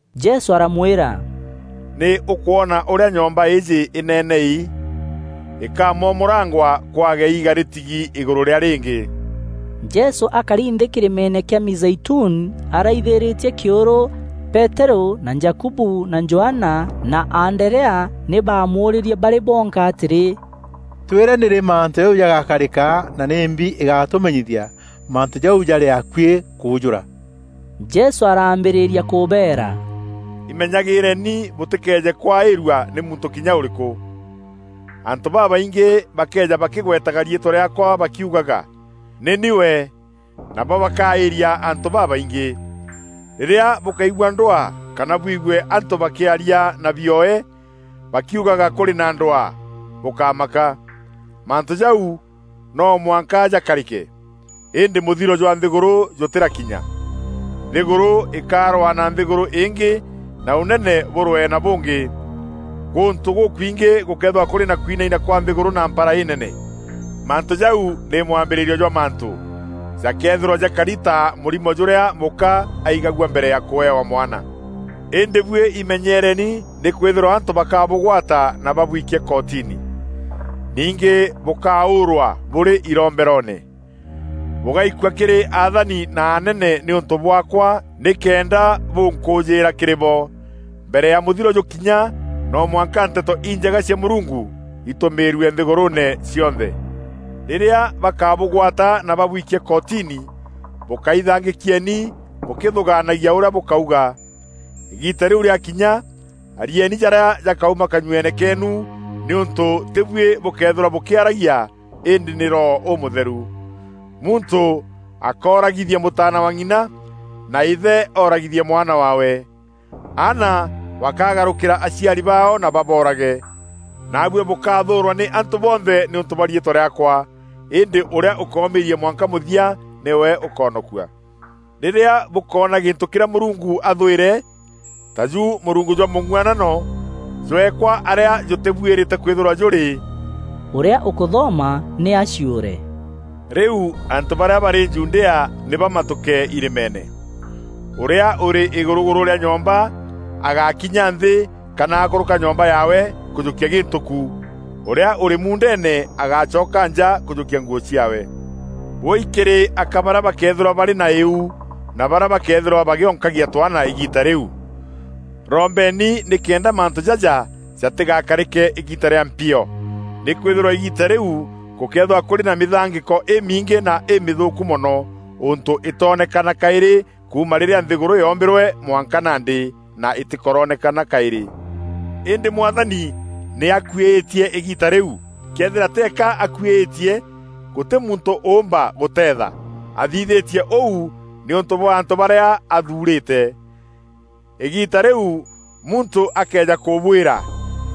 Jesû aramwîra, “Nî ûkwona ûrîa nyomba iji inenei? Ikamomorangwa kwage iiga rîtigi îgûrû rîa rîngî.” Jesû akari nthî kîrîmeene kîa Mîzeituni araithîrîtie kîûrû, Peterû na Jakubu na Johana na Anderea nî baamûûrîrie barî bonka atîrî, “Twîre nîrî mantû jau jagakarîka na nîmbi îgatûmenyithia mantû jau jarî akuî kûûjûra?” Jesû araambîrîria kûbeera, “Imenyagîîreni bûtîkeeje kwaîrua nî muntû kinya ûrîkû. Antû babaingî bakeeja bakîgwetaga riîtwa rîaakwa bakiugaga, ‘Nî ni we!’ Nabo bakaîria antû babaingî. Rîrîa bûkaigua ndwaa kana bûigue antû bakîarîa na bioe bakiugaga kûrî na ndwaa, bûkámaka. Mantû jau noo mwanka jakarîke, îndî mûthiro jwa nthîgûrû jûtîrakinya. Nthîgûrû îkarwaa na nthîgûrû îngî na ûnene bûrwee na bûngî. Gûntû gûkwingî gûkeethîrwa kûrî na kwinaina kwa nthîgûrû na mpara înene. Mantû jau nî mwambîrîrio jwa mantû. Jakeethîrwa jakari ta mûrimo jûrîa mûka aigagua mbere ya kûewa mwana. “Îndî buî imenyeereni nîkwîthîrwa antû bakabûgwata na babwikie kotini. Ningî bûkaûûrwa bûrî iromberoone. Bûgaikua kîrî athani na anene nîûntû bwaakwa nîkenda bûnkûjîîra kîrî bo. Mbere ya mûthiro jûkinya no mwanka Nteto Injega cia Mûrungu itûmîîrue nthîgûrûûne cionthe. Rîrîa bakabûgwata na babwikie kotini, bûkaithangîkieni bûkîthûgaanagia ûrîa bûkauga. Îgiita rîu rîakinya, arieni jarîa jakauma kanyueene keenu nîûntû tî buî bûkeethîrwa bûkîaragia îndî nî Roho Ûmûtheru. Muntû akooragithia mûtaana wa ng'ina, na îthe ooragithie mwana waawe. Aana bakagarûkîra aciari baao na baboorage. Naabuî bûkathûûrwa nî antû bonthe nîûntû bwa riîtwa rîaakwa. Îndî ûrîa ûkoomîîria mwanka mûthia nîwe ûkoonokua.” “Rîrîa bûkoona gîntû kîrîa Mûrungu athwîre, taju mûrungu jwa mûng'uanano, jweekwa arîa jûtîbuîrîte kwîthîrwa jûrî, (ûrîa ûkûthoma nî aciûre) rîu antû barîa barî Judea nî bamatûke irîmeene. Ûrîa ûrî îgûrûgûrû rîa nyomba agákinya nthî kana akûrûka nyomba yaawe kûjûkia gîntû ku. Ûrîa ûrî muundeene agácoka nja kûjûkia nguû ciaawe. Wûûi kîrî aka barîa bakeethîrwa barî na îu na barîa bakeethîrwa bagîonkagia twaana îgiita rîu! Rombeni nîkenda mantû jaja jatîgakarîke îgiita rîa mpio. Nîkwîthîrwa îgiita rîu gûkeethîrwa kûrî na mîthangîko îmingî na îmîthûûku mono, ûntû îtoonekana kaîrî kuuma rîrîa nthîgûrû yoombîrwe mwanka nandî, na îtîkoronekana kaîrî. Îndî Mwathani nî akuîîtie îgiita rîu. Këethîra teeka akuîîtie, gûtî muntû ûûmba gûteetha. Athithîtie ûu nîûntû bwa antû barîa athuurîte. “Îgiita rîu muntû akëeja kûbwîra,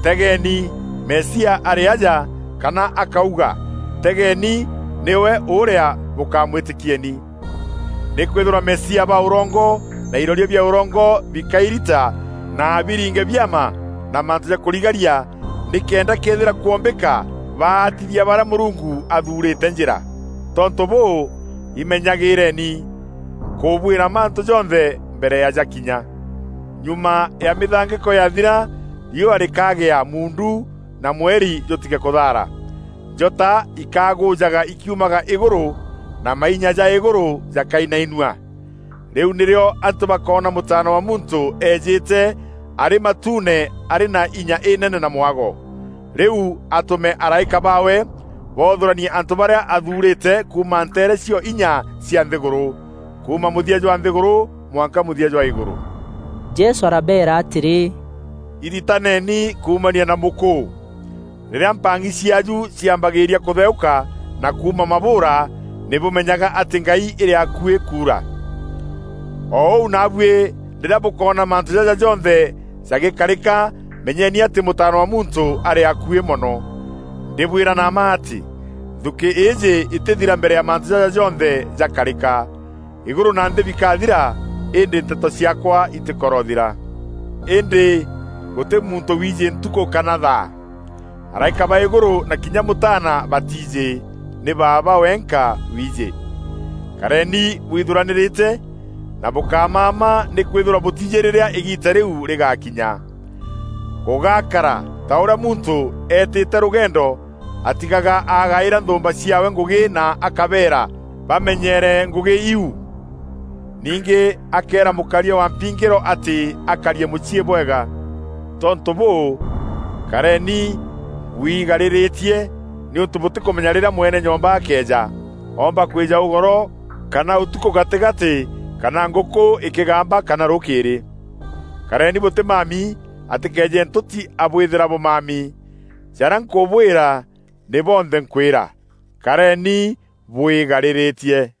‘Tegeeni, Mesia arî aja,’ kana akauga ‘Tegeeni, nîwe ûrîa!’ Bûkamwîtîkieni. Nîkwîthîrwa Mesia ba ûrongo na iroria bia ûrongo bikairita na biringe biama na mantû ja kûrigaria nîkenda këethîra kwombîka baatithia barîa Mûrungu athuurîte njîra. Tontû bûû, imenyagîîreni. Nkûbwîra mantû jonthe mbere ya jakinya. “Nyuma ya mîthangîko yaathira, riûa rîkagîa muundu na mweri jûtige kûthaara. Njota ikagûjaga ikiumaga îgûrû, na mainya ja îgûrû jakainainua. Rîu nîrîo antû bakoona Mûtaana wa Muntû eejîte arî matuune arî na inya înene na mwago. Rîu atume araîka baawe boothûranie antû barîa athuurîte kuuma nteere cio inya cia nthîgûrû; kuuma mûthia jwa nthîgûrû mwanka mûthia jwa îgûrû.” Jesû arabeera atîrî, “Iritaneeni kuumania na mûkûû: rîrîa mpang'i ciaaju ciambagîîria kûtheûka na kuuma mabûûra, nî bûmenyaga atî ngai îrî akuî kuura. O ûu naabuî rîrîa bûkoona mantû jaja jonthe jagîkarîka menyeni atî Mûtaana wa Muntû arî akuî mono. Ndîbwîra na mma atî, nthukî îîjî îtîthira mbere ya mantû jaja jonthe jakarîka. Îgûrû na nthî bikathira, îndî nteto ciaakwa itîkorothira. “Îndî gûtî muntû wiijî ntukû kana thaa; araîka ba îgûrû na kinya Mûtaana batiijî; nî Baaba wenka wiijî. Kareeni bwithuranîrîte na bûkámama nîkwîthîrwa bûtiijî rîrîa îgiita rîu rîgaakinya. Gûgakara ta ûrîa muntû eetîte rûgendo atigaga agaîra nthûûmba ciaawe ngûgî na akabeera bamenyeere ngûgî iu. Ningî akeera mûkaria wa mpingîro atî akarie mûciî bwega. Tontû bûû, kareni bwigarîrîtie nîûntû bûtîkûmenya rîrîa mwene nyomba akeeja; oomba kwîja ûgoro kana ûtukû gatîgatî kana ngûkû îkîgamba kana rûkîîrî. Kareni bûtîmami atîkeeje ntûti abwîthîra bûmami. Jarîa nkûbwîra, nî bonthe nkwîra. Kareni bwîgarîrîtie!”